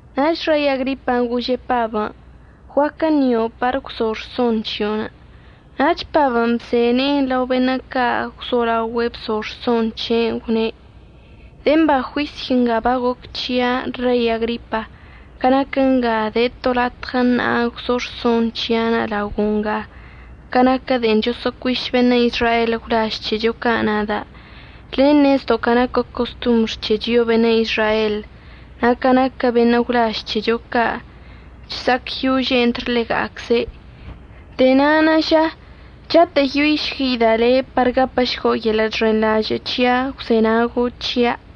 Nach Rei Agripan' gože' Pabən': —Guaquə ṉio' par əgwzo' rson c̱hio'onə'. Nach Pabən' bze ne'en lao beṉə' ca' gwzolaogüe' bzo rson c̱he'enə' gwne': —De'e mba juisy nga bagoc c̱hia', Rei Agripa, ca naquə nga de to latɉə ṉa'a gwzo rson c̱hia'anə' laogo' nga ca naquə de'en choso'ocuiš beṉə' Izrael gwlaž c̱hecho ca' nada'. Le' ṉezdo' ca naquə costombr c̱he chio'o beṉə' Izrael, na' ca naquə beṉə' gwlaž c̱hecho ca' chsa'acyože' entr ḻega'acze'. De'e na'anə' ža chatə'əyoišgueida' le' par gapəšgo' yeḻə' chxenḻažə' əgwzenago' c̱hia'.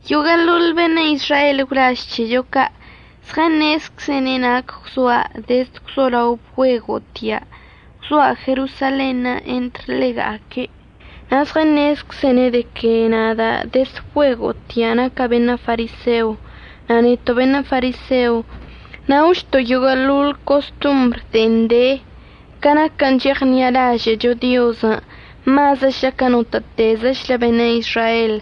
Yoguə'əḻoḻ beṉə' Izrael gwlaž c̱hecho ca' zɉəṉezczene' nac gwzoa' dezd gwzolao bgüego'otia', gwzoa' Jerosalenṉə' entr ḻega'aque'. Na' zɉəṉezczene' de que nada' dezd bgüego'otia' naca' beṉə' fariseo, na' neto' beṉə' fariseo naochto' yoguə'əḻoḻ costombr de'en de ca naquən' cheɉṉi'alažə'əcho Diozən' mazəchlə ca notə'ətezəchlə beṉə' Izrael.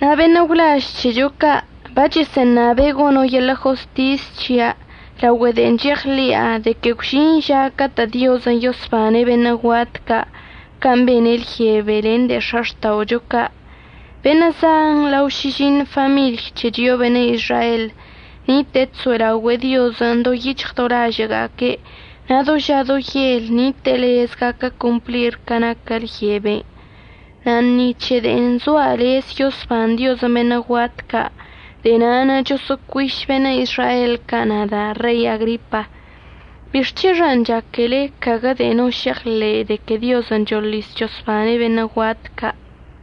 Na' beṉə' gwlaž c̱hecho ca' bachəsə'əṉabe' gono' yeḻə' jostis c̱hia' laogüe de'en cheɉḻi'a de que gwžin ža catə' Diozən' yosbane' beṉə' guat ca' can' bene' lyebe len de'e x̱axta'ocho ca'. Beṉə' zan lao šižiṉ famiḻy c̱he chio'o beṉə' Izrael nite'e chso'elaogüe'e Diozən' do yic̱hɉ do lažə'əga'aque' na' do ža do yel nite'e lez gaquə complir ca naquə lyeben'. Na' ni c̱he de'en zoa' lez yosban Diozən' beṉə' guat ca', de'e na'anə' choso'ocuiš beṉə' Izrael ca' nada' Rei Agripa. ¿Bixc̱hexan' chaque le'e caguə de'e no šeɉḻe'enə' de que Diozən' choḻis chosbane' beṉə' guat ca'?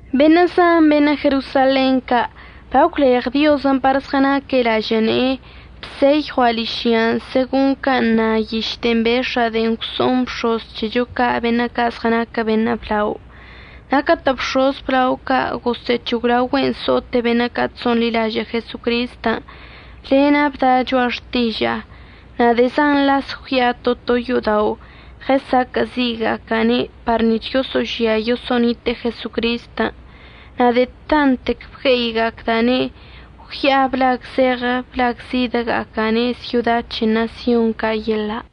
Beṉə' zan beṉə' Jerosalen ca' bagwleɉ Diozən' par zɉənaque' lažə' ne'enə' bseyɉua' ližya segon can' na yiš de'en bex̱a'a de'en gwso'oṉ bx̱oz c̱hecho ca' beṉə' ca' zɉənaquə beṉə' blao. Na' catə' bx̱oz əblao ca' gosə'əc̱hoglaogüe'en so'ote' beṉə' ca' chso'onḻilažə' Jesocristən' lena' bda' cho'a xtiža'a. Na' de'e zan las gwya'a to to yo'odao' ɉəsaquə'əzi'iga'aca'ane' par nic̱h yoso'ožia yoso'onite'e Jesocristən'. Na' de'e tanttec bgue'iga'acda'ane' gwya'a blagzeɉə blagzidəga'aca'ane' syoda c̱he ṉasyon ca' yeḻa'.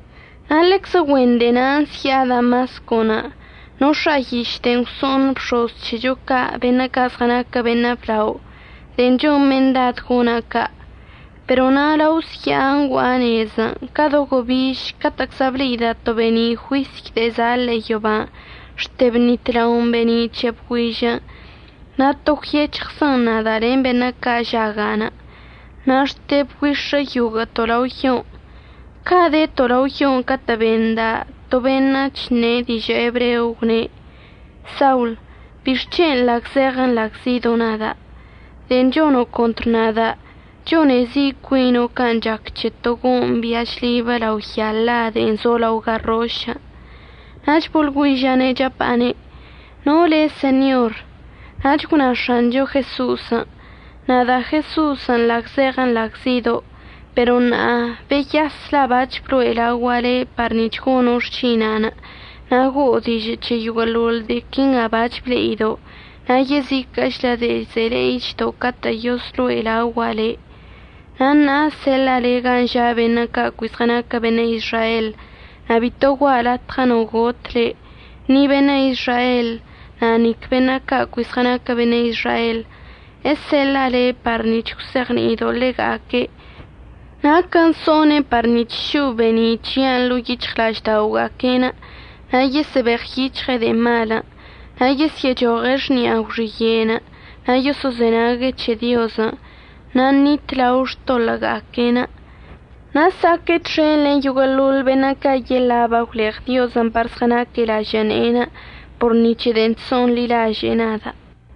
Na' ḻeczə güen de'e na' əzya'a Damascon'. Nox̱a'a yiš de'en gwso'on bx̱oz c̱hecho ca' beṉə' ca' zɉənaquə beṉə' blao de'en chon mendad gona' ca'. Pero na' lao əzya'a ngua'a nezən' ca do gobiž catə'əczla ble'ida' to be'eni' juisy de'e za' ḻe'e yoban' xte bnitlaon be'eni' c̱he bgüižən' na' to gwyec̱hɉzən nada' len beṉə' ca' žaga'anə'. Na' xte bgüix̱ə yoguə'əto' lao yon'. Ca' deto' lao yon' catə' benda' to beṉə' chṉe' dižə' ebreo gwne': “Saul, ¿bixc̱hen' nḻagzeɉə nḻagzido' nada'? De'en chono' contr nada' chone zi' cuino' can' chac c̱he to go'oṉ bian' chlibə lao ya la de'en zo lao garrošən'.” Nach boḻgüiža'ane' chapa'ane': “¿No le' Señor?” Nach gwna X̱ancho Jeso'osən': “Nada' Jeso'osən' nḻagzeɉə nḻagzido'. Pero ṉa'a beyas la' bac̱h bloe' laogua' le' par nic̱h gono' xšina'anə' na' go'o dižə' c̱he yoguə'əḻoḻ de'e quinga bac̱h ble'ido', na' yeziquə'əchlə de'e ze'e le'ichdo' catə' yozloe' laogua' le'. Na' ṉa'a əseḻa'a le' gan' ža' beṉə' ca' cui zɉənaquə beṉə' Izrael na' bito gua'a latɉə no got le', ni beṉə' Izrael na' nic beṉə' ca' cui zɉənaquə beṉə' Izrael. Eseḻa'a le' par nic̱h əgwzeɉni'ido' ḻega'aque' nac so'one' par nic̱h šo'o be'eni' c̱hia'anə' ḻo'o yic̱hɉla'ažda'oga'aque'enə' na' yesə'əbeɉyic̱hɉe' de'e malən'. Na' yesyə'əchoɉe' xni'a gwxiye'enə' na' yoso'ozenague' c̱he Diozən' na' ṉitlao xtoḻə'əga'aque'enə', na' əsa'aque' txen len yoguə'əḻoḻ beṉə' ca' yeḻa' bagwleɉ Diozən' par zɉənaque' lažə' ne'enə' por ni c̱he de'en chso'onḻilaže'e nada'.”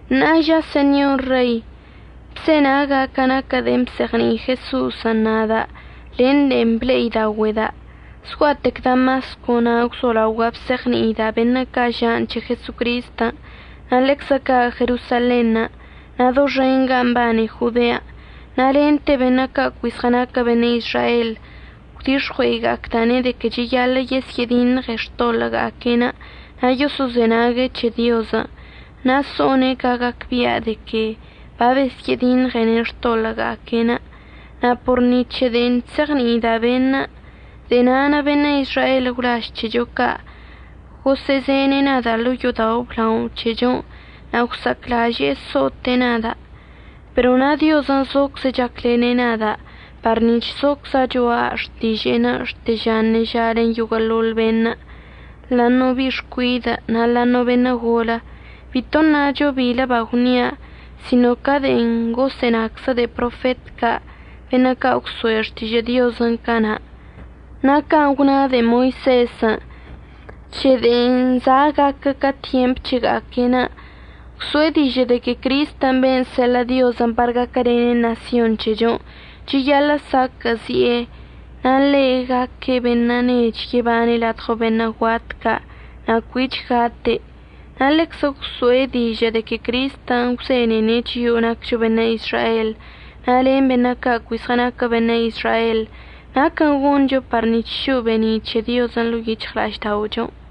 Ṉa'a ža Señor Rei, bzenaga' ca naquə de'en bzeɉni'i Jeso'osən' nada' len de'en ble'idaogüe'eda'. Zgua'atec Damasco na' gwzolaogua' bzeɉni'ida' beṉə' ca' ža'anə' c̱he Jesocristən', na' ḻeczə ca' Jerosalenṉə' na' doxen gan' mbane Jodean'. Na' lente beṉə' ca' cui zɉənaquə beṉə' Izrael gwdix̱ɉue'iga'acda'ane' de que cheyaḻə' yesyə'ədiṉɉene' xtoḻə'əga'aque'enə' na' yoso'ozenague' c̱he Diozən', na' so'one' ca gacbia' de que babesyə'ədiṉɉene' xtoḻə'əga'aque'enə'. Na' por ni c̱he de'en chzeɉni'ida' beṉə', de'e na'anə' beṉə' Izrael gwlaž c̱hecho ca' gosə'əzene' nada' ḻo'o yo'odao' əblao c̱hechon' na' gwsa'aclaže'e so'ote' nada'. Pero na' Diozən' zocze' chaclene' nada' par nic̱h zocza' cho'a xtiže'enə' xte ža ṉeža len yoguə'əḻoḻ beṉə', ḻa'aṉə' bi'i xcuidə' na' ḻa'aṉə' beṉə' golə. Bito ṉacho bilə bagwnia' sino ca de'en gosə'ənaczə de'e profet ca' beṉə' ca' gwso'e xtižə' Diozən' cana', na' can' gwna de'e Moisezən' c̱he de'en za' gaquə ca tyemp c̱hega'aque'enə'. Gwso'e dižə' de que Cristən' ben' seḻə' Diozən' par gaquəlene' ṉasyon c̱hechon' cheyaḻə' saquə'əzi'e na' ḻe' gaque' beṉə' nech yebane' ladɉo beṉə' guat ca' na' cuich gate'. Na' ḻeczə gwso'e dižə' de que Cristən' gwzenene' chio'o naccho beṉə' Izrael na' len beṉə' ca' cui zɉənaquə beṉə' Izrael naquən' goncho par nic̱h šo'o be'eni' c̱he Diozən' ḻo'o yic̱hɉla'ažda'ochon'.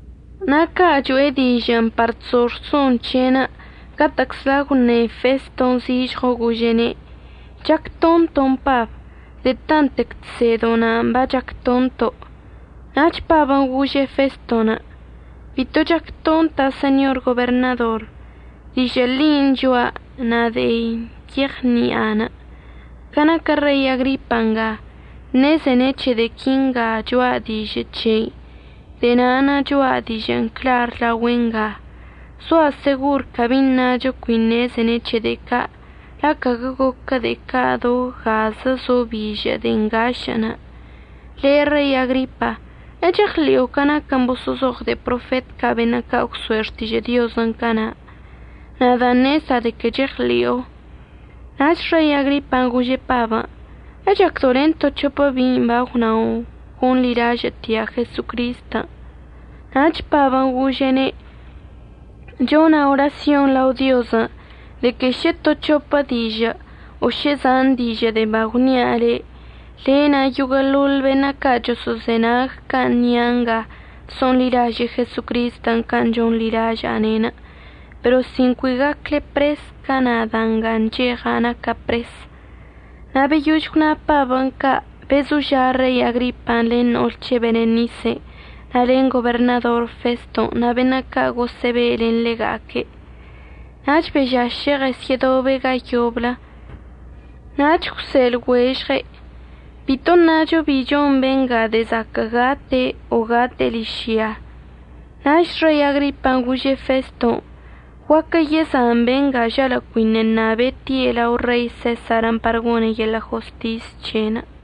Na' ca' cho'e dižə'ənə' par chzo rson c̱he'enə' catə'əczla gwṉe Feston' zižɉo gože'ene': —Chac tonton' Pab. De'e tanttec chsedo' na'anə' bac̱h chac tonto'. Nach Pabən' gože' Feston': —Bito chac tonta' Señor Goberṉador. Dižə' ḻin' cho'a na' de'e yeɉni'anə'. Ca naquə Rei Agripa nga, ṉezene' c̱he de'e quinga cho'a dižə' c̱hei na' de'e na'anə' cho'a dižə'ən clar laogüe' nga. Zoa' segor cabi ṉacho cui ṉezene' c̱he' de'e ca', la' caguə goquə de'e ca' do gazə zo bižə' de'e ngašə'ənə'. Le' Rei Agripa, ¿əcheɉḻi'o ca naquən' boso'ozoɉ de'e profet ca' beṉə' ca' gwso'e xtižə' Diozən' cana'? Nada' ṉezda' de que cheɉḻi'o. Nach Rei Agripan' gože' Pabən': —¿Echacdo' len to c̱hopə bi'in bagwna'onə' gonḻilažə'ətia' Jesocristən'? Nach Pabən' gože'ene': —Chona' orasyon lao Diozən' de que šə to c̱hopə dižə' o šə zan dižə' de'e bagwnia' le', le' na' yoguə'əḻoḻ beṉə' ca' choso'ozenag can' əṉia' nga so'onḻilaže'e Jesocristən' can' chonḻilaža'ane', pero sin cui gacle pres ca nada' nga ncheɉa' naca' pres. Na' beyož gwna Pabən' ca' bezoža' Rei Agripan' len no'ol c̱he' Berenisen' na' len goberṉador Feston' na' beṉə' ca' gosə'əbe' len ḻega'aque'. Nach bežaše' ɉəsyə'ədobe' ga yoblə nach gwse'e lɉuežɉe': —Bito əṉacho bi chon benga de'e zaquə' gate' o gate'e ližya. Nach Rei Agripan' gože' Feston': —Guaquə yezan benga žalə' cuiṉə' ṉabe' tie' lao Rei Sesarən' par gone' yeḻə' jostis c̱he'enə'.